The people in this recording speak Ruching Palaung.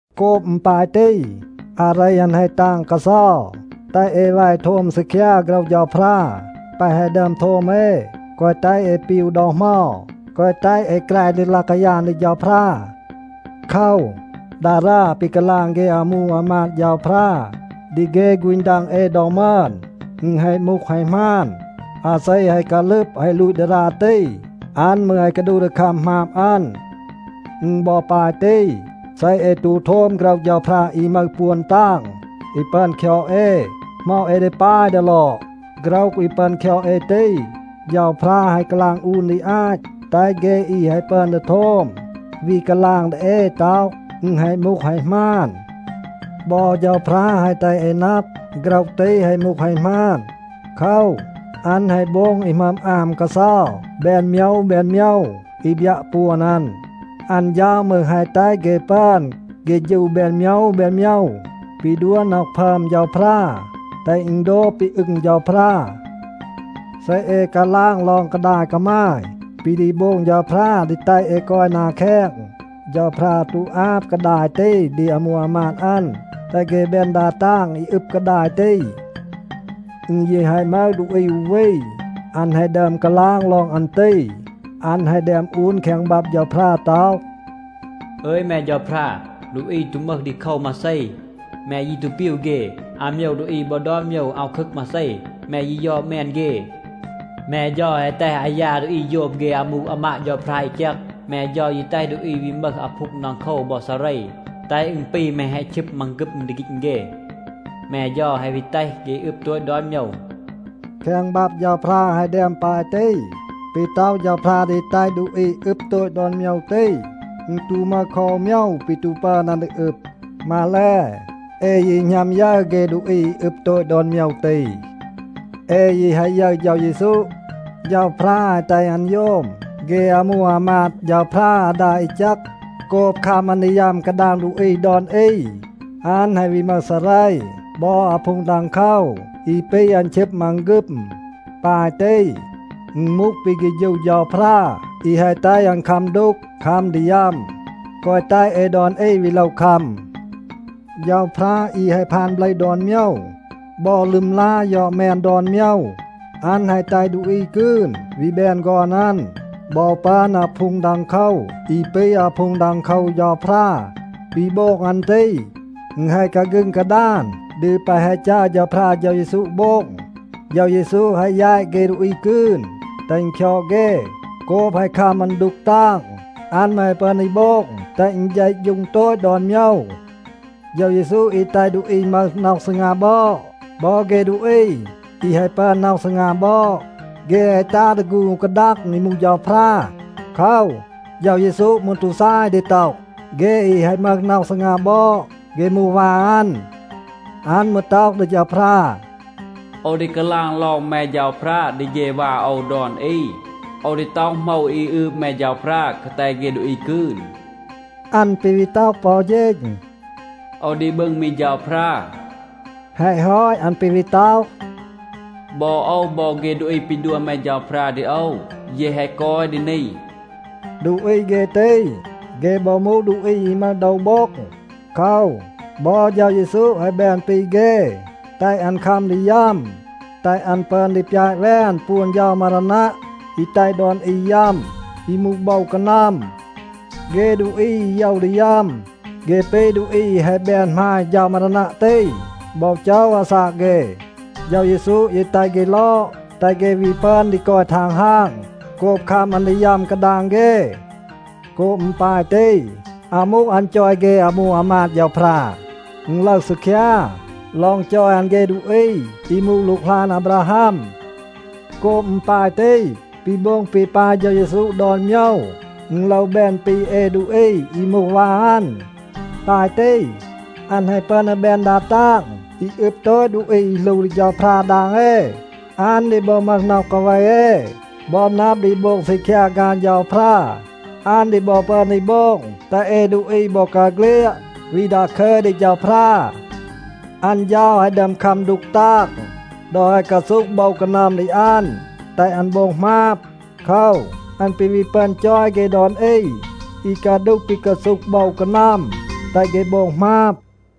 โกบ อึณ ปาย ตี, อาเร อัน แฮะ ตาง กาเซา, แตห เอ แว โทม ซีคยา โฆรห เฌาพรา แปะ แฮะ ดึอม โทม เอ, แกวะ แตห เอ ปีว ดอ เหมา, แกวะ แตห เอ แกร ดี ลาย กายาน ดี เฌาพรา. โคว, ดารา ปี กาลาง เฆ อามู อามาด เฌาพรา ดี เฆ ฆูณ ดัง เอ ดอ มึอน, อึณ แฮะ มูห แฮะ หมาน. อาเซ แฮะ กาลึบ แฮะ ลูต ดารา ตี, อัน มืร แฮะ กาดูห ดี คัม หมาบ อัน. อึณ บอ ปาย ตี. เซ เอ ตู โทม โฆรห เฌาพรา อี มึห ปวน ตาง อี ปึอน คยอด เอ, เหมา เอ ดี ปาย ดี ลอด? โฆรห อี ปึอน คยอด เอ ตี, เฌาพรา แฮะ กาลาง อูน ดี อาต, แตห เฆ อี แฮะ ปึอน ดี โทม วี กาลาง ดี เอ ต็อห, อึณ แฮะ มูห แฮะ หมาน. บอ เฌาพรา แฮะ แตห เอ นับ, โฆรห ตี แฮะ มูห แฮะ หมาน. โคว, อัน แฮะ โบง อี หมึอม อาม กาเซา แบน โมยว แบน โมยว อี บยัะ ปวน อัน. อัน เฌา มืร แฮะ แตห เฆ ปึอน เฆฌู แบน โมยว แบน โมยว ปี ดัว น็อห พึอม เฌาพรา, แตห อึณ โดบ ปี อึง เฌาพรา. เซ เอ กาลาง ลอง กาดาย กามาย ปี ดี โบง เฌาพรา ดี แตห เอ กอย นา แคง, เฌาพรา ตู อาบ กาดาย ตี ดี อามู อามาด อัน, แตห เฆ แบน ดา ตาง อี อึบ กาดาย ตี. อึณ ยี แฮะ มึห ดูอี อู วี, อัน แฮะ ดึอม กาลาง ลอง อัน ตี. อัน แฮะ แดม อูน แคง บับ เฌาพรา ต็อห, “อึย แม เฌาพรา, ดูอี ตู มึห ดีโคว มาเซ. แม ยี ตู ปีว เฆ. อาโมยว ดูอี บอ ดอน โมยว อาว คึกคัม มาเซ. แม ยี ยอด แมน เฆ. แม เฌา แฮะ แตห อายา ดูอี โยม เฆ อามู อามาด เฌาพรา อี แจก. แม เฌา ยี แตห ดูอี วี มึห อาพูง ดังโคว บอ ซาเร, แตห อึณ ปี แม แฮะ ชึบ มังฆึม ดี ฆีณ เฆ. แม เฌา แฮะ วี แตห เฆ อึบ โตต ดอน โมยว.” แคง บับ เฌาพรา แฮะ แดม ปาย ตี. ปี ต็อห เฌาพรา ดี แตห ดูอี อึบ โตต ดอน โมยว ตี, อึณ ตู มึห คอ อู โมยว ปี ตู ปึอน อัน ดี อึบ. มาแล, เอ ยี หณัม ยึร เฆ ดูอี อึบ โตต ดอน โมยว ตี. เอ ยี แฮะ ยึร เฌา เยซู. เฌาพรา แฮะ แตห อัน โยม เฆ อามู อามาด เฌาพรา อาดา อี แจก. โกบ คัม อัน ดี ยัม กาดาง ดูอี ดอน อี, อัน แฮะ วี มึห ซาเร บอ อาพูง ดังโคว อี ปี อัน ชึบ มังฆึม. ปาย ตี, อึณ มูห ปี เฆฌู เฌาพรา อี แฮะ แตห อัน คัม ดูก, คัม ดี ยัม, แกวะ แตห เอ ดอน อี วี โลว คัม. เฌาพรา อี แฮะ พาน เบลห ดอน โมยว บอ ลึมลา ยอด แมน ดอน โมยว, อัน แฮะ แตห ดูอี กืน วี แบน ฆอน อัน บอ ปึอน อาพูง ดังโคว อี ปี อาพูง ดังโคว เฌาพรา. ปี โบง อัน ตี, อึณ แฮะ กาฆึง กาดาน ดี แปะ แฮะ จัร เฌาพรา เฌา เยซู โบง. เฌา เยซู แฮะ แยต เฆ ดูอี กืน, แตห อึณ คยอด เฆ. โกบ แฮะ คัม อัน ดูก ตาง, อัน มืร แฮะ ปึอน ดี โบง แตห อึณ เฌะฌูง โตต ดอน โมยว. เฌา เยซู อี แตห ดูอี มึห น็อห ซีงา บอด บอ เฆ ดูอี อี แฮะ ปึอน น็อห ซีงา บอด, เฆ แฮะ ตัห ดี ฆูณ อู กาดัง อี มูห เฌาพรา. โคว, เฌา เยซู มืร ตู ซาย ดี ต็อห, เฆ อี แฮะ มึห น็อห ซีงา บอด, เฆ มูห วา อัน. อัน มืร ต็อห ดี เฌาพรา, “โอว ดี กาลาง ลอง แม เฌาพรา ดี เฆ วา โอว ดอน อี. โอว ดี ต็อห โหมว อี อืบ แม เฌาพรา กาแต เฆ ดูอี กืน.” อัน ปี วี ต็อห ปอ อู เฌณ, “โอว ดี บึง มี เฌาพรา.” แฮะ ฮอต, อัน ปี วี ต็อห, “บอ โอว บอ เฆ ดูอี ปี ดัว แม เฌาพรา ดี โอว, เย แฮะ กอย ดี นี.” ดูอี เฆ ตี, เฆ บอ มูห ดูอี อี มึห โดว โบ็ง. โคว, บอ เฌา เยซู แฮะ แบน ปี เฆ, แตห อัน คัม ดี ยัม, แตห อัน ปึอน ดี ปยาต แวน ปวน เฌา มารานัะ อี แตห ดอน อี ยัม, อี มูห โบว กานัม. เฆ ดูอี อี โยว ดี ยัม, เฆ ปี ดูอี อี แฮะ แบน หมาย เฌา มารานัะ ตี บอ โจว อาซาก เฆ. เฌา เยซู ยี แตห เฆ ลอด, แตห เฆ วี ปึอน ดี กอย ทังฮาง โกบ คัม อัน ดี ยัม กาดาง เฆ. โกบ อึณ ปาย ตี, อาว มูห อัน จอย เฆ อามู อามาด เฌาพรา. อึณ ลึห ซีคยา ลอง จอย อัน เฆ ดูอี อี มูห หลูกหลาน อาบราฮัม. โกบ อึณ ปาย ตี, ปี โบง ปี ปาย เฌา เยซู ดอน โมยว, อึณ โลว แบน ปี เอ ดูอี อี มูห วา อัน. ปาย ตี, อัน แฮะ ปึอน ดี แบน ดา ตาง อี อึบ โตต ดูอี อี หลู ดี เฌาพรา ดาง เอ. อัน ดี บอ มึห น็อห กาเว เอ บอ นับ ดี โบง ซีคยา ฆาน เฌาพรา. อัน ดี บอ ปึอน ดี โบง แตห เอ ดูอี บอกาเฆลียด วี ดาคึย ดี เฌาพรา. อัน เฌา แฮะ ดึอม คัม ดูก ตาง ดอ แฮะ กาซูห โบว กานัม ดี อัน, แตห อัน โบง หมาบ. โคว, อัน ปี วี ปึอน จอย เฆ ดอน อี อี กาดูห ปี กาซูห โบว กานัม, แตห เฆ โบง หมาบ.